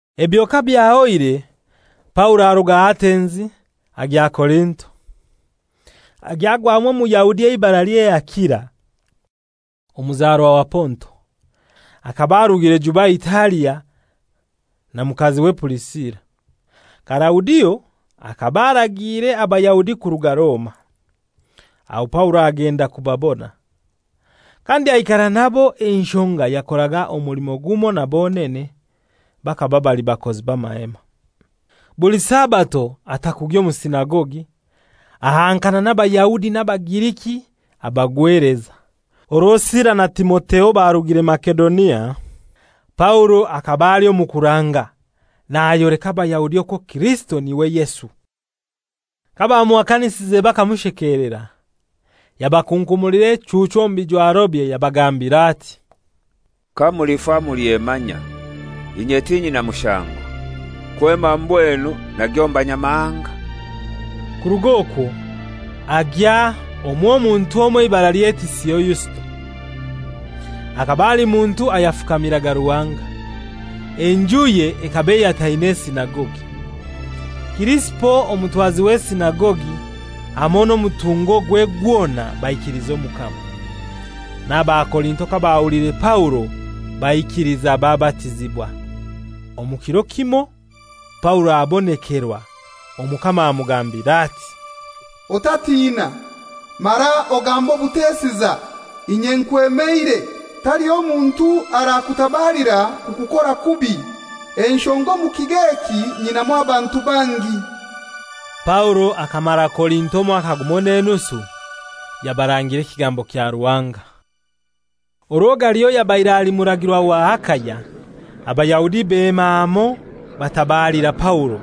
Ebyo kabyahoire Paulo aruga Atenzi agya Korinto. Agya agwamu Omuyahudi eibaralye Akila, omuzarwa wa Ponto. Akaba arugire juba Italia na mukaziwe Purisila. Kalaudio akaba aragiire Abayahudi kuruga Roma. Aho Paulo agenda kubabona, kandi aikara nabo enshonga yakoraga omulimo gumoi na bonene, bakaba bali bakozi b'amahema. Buli Sabato ata kugya omu sinagogi, ahankana n'Abayahudi n'Abagiriki abagweleza. Orwo Sila na Timotheo barugire Masedonia, Paulo akaba ali omu kuranga, nayoleka Abayahudi okwo Kirisito n'iwe Yesu. Kabamuhakanisize bakamushekelera, yabakunkumulira echuuchu omu bijwarobye yabagambira ati, «Kamulifa mulyemanya! Inye tinyina mushango. Kwema mbwenu nagya omu Banyamahanga.» Kurug'okwo agya omw'omuntu omoi eibaralye Tisio Yusito, akaba ali muntu ayafukamiraga Ruhanga. Enjuye ekaba eyataine esinagogi. Kirisipo, omutwazi w'esinagogi hamoi n'omutungogwe gwona baikiliza Omukama. N'AbaKorinto kabahuliire Paulo baikiliza babatizibwa. Omu kiro kimoi Paulo abonekerwa, Omukama amugambira ati, «Otatina, mara ogambe obutesiza. Inye nkwemeire; taliho muntu arakutabalira kukukora kubi; enshonga omu kigo eki nyinamu abantu bangi.» Paulo akamara Korinto omwaka gumoi n'enusu, yabarangira ekigambo kya Ruhanga. Orwo Galio yabaire ali muragirwa wa Akaya, Abayahudi bema hamoi batabalira Paulo,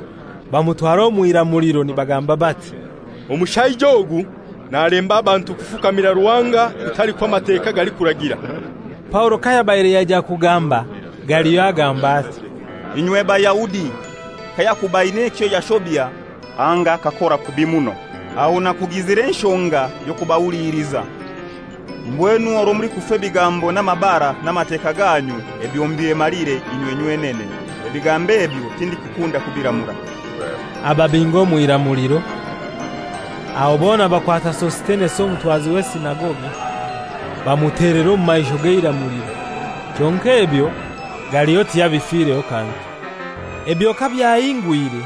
bamutwara omw'iramuliro nibagamba bati, «Omushaija ogu nalemba abantu kufukamira Ruhanga kutali kw'Amateka galikuragira.» Paulo kayabaire yaija kugamba, Galio agamba ati, «Inywe Bayahudi! Kayakuba aina ekyo yashobya anga akakora kubi muno, aho nakugizire enshonga y'okubahuliliza. Mbwenu orwo mulikufa ebigambo n'amabara n'Amateka ganyu, ebyo mubyemalire inywe nywenene. Ebigambo ebyo tindikukunda kubiramura.» Ababinga omw'iramuliro. Aho bona bakwata Sositenesi omutwazi w'esinagogi, bamutelera omu maisho g'eiramuliro. Kyonkai ebyo Galio tiyabifireho kantu. Ebyo kabyahingwire,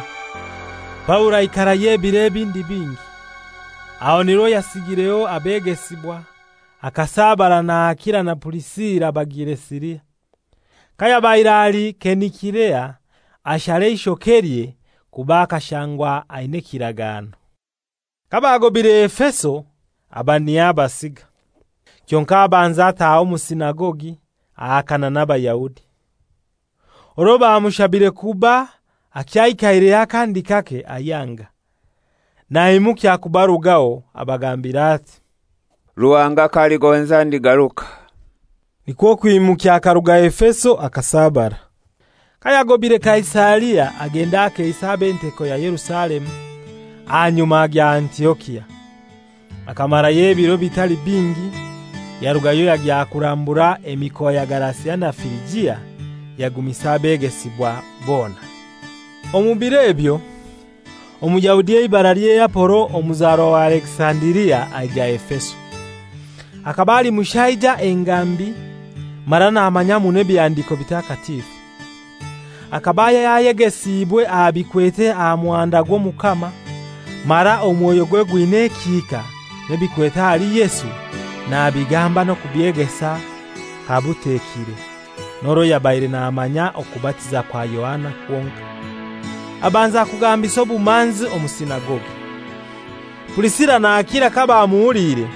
Paulo aikarayo ebiro ebindi bingi, aho nirwo yasigireho abegesibwa akasabara na Akila na Purisila bagiire Siria. Kayabaire ali Kenikirea ashara eishokelye, kuba akashangwa aina ekiragano. Kabagobaire Efeso aba niho abasiga. Kyonkai abanza ataaha omu sinagogi ahakana n'Abayahudi. Orwo bamushabire kuba akyaikaireyo akandi kake, ayanga. Naimukya kubarugaho abagambira ati, «Ruhanga k'aligonza ndigaruka.» Nikwo kwimukya akaruga Efeso akasabara. Kayagobaire Kaisaria agenda akeisa ab'enteko ya Yerusalemu, ahanyuma agya Antiokia. Akamarayo ebiro bitali bingi yarugayo yagya kurambura emikoa ya Galasia na Firijia, yagumisa abegesibwa bona. Omu biro ebyo, Omuyahudi eibaralye Apolo omuzarwa wa Alekisandiria aija Efeso. Akaba ali mushaija engambi mara namanya muno Ebihandiko Bitakatifu. Akaba yayegesiibwe aha bikwete aha muhanda gw'Omukama mara omwoyogwe gwina ekihika, n'ebikwete ahali Yesu nabigamba n'okubyegesa kabutekire, n'orwo yabaire namanya okubatiza kwa Yohana kwonkai. Abanza kugambisa obumanzi omu sinagogi. Purisila na Akila kabamuhuliire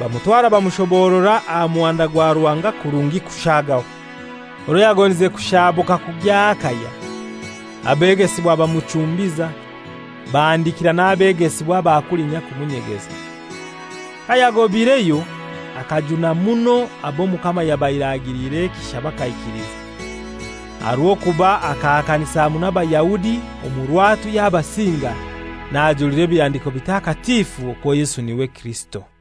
bamutwara bamushoborora aha muhanda gwa Ruhanga kurungi kushaagaho. Orwo yagondize kushaabuka kugya Akaya, abegesibwa bamuchumbiza, bahandikira n'abegesibwa aba kulinya kumunyegeza. Kayagobaireyo akajuna muno ab'Omukama yabaire agiliire ekisha bakaikiliza, aha rw'okuba akahakanisa muno Abayahudi omu rwatu yabasinga, najuliza Ebihandiko Bitakatifu okwo Yesu n'iwe Kirisito.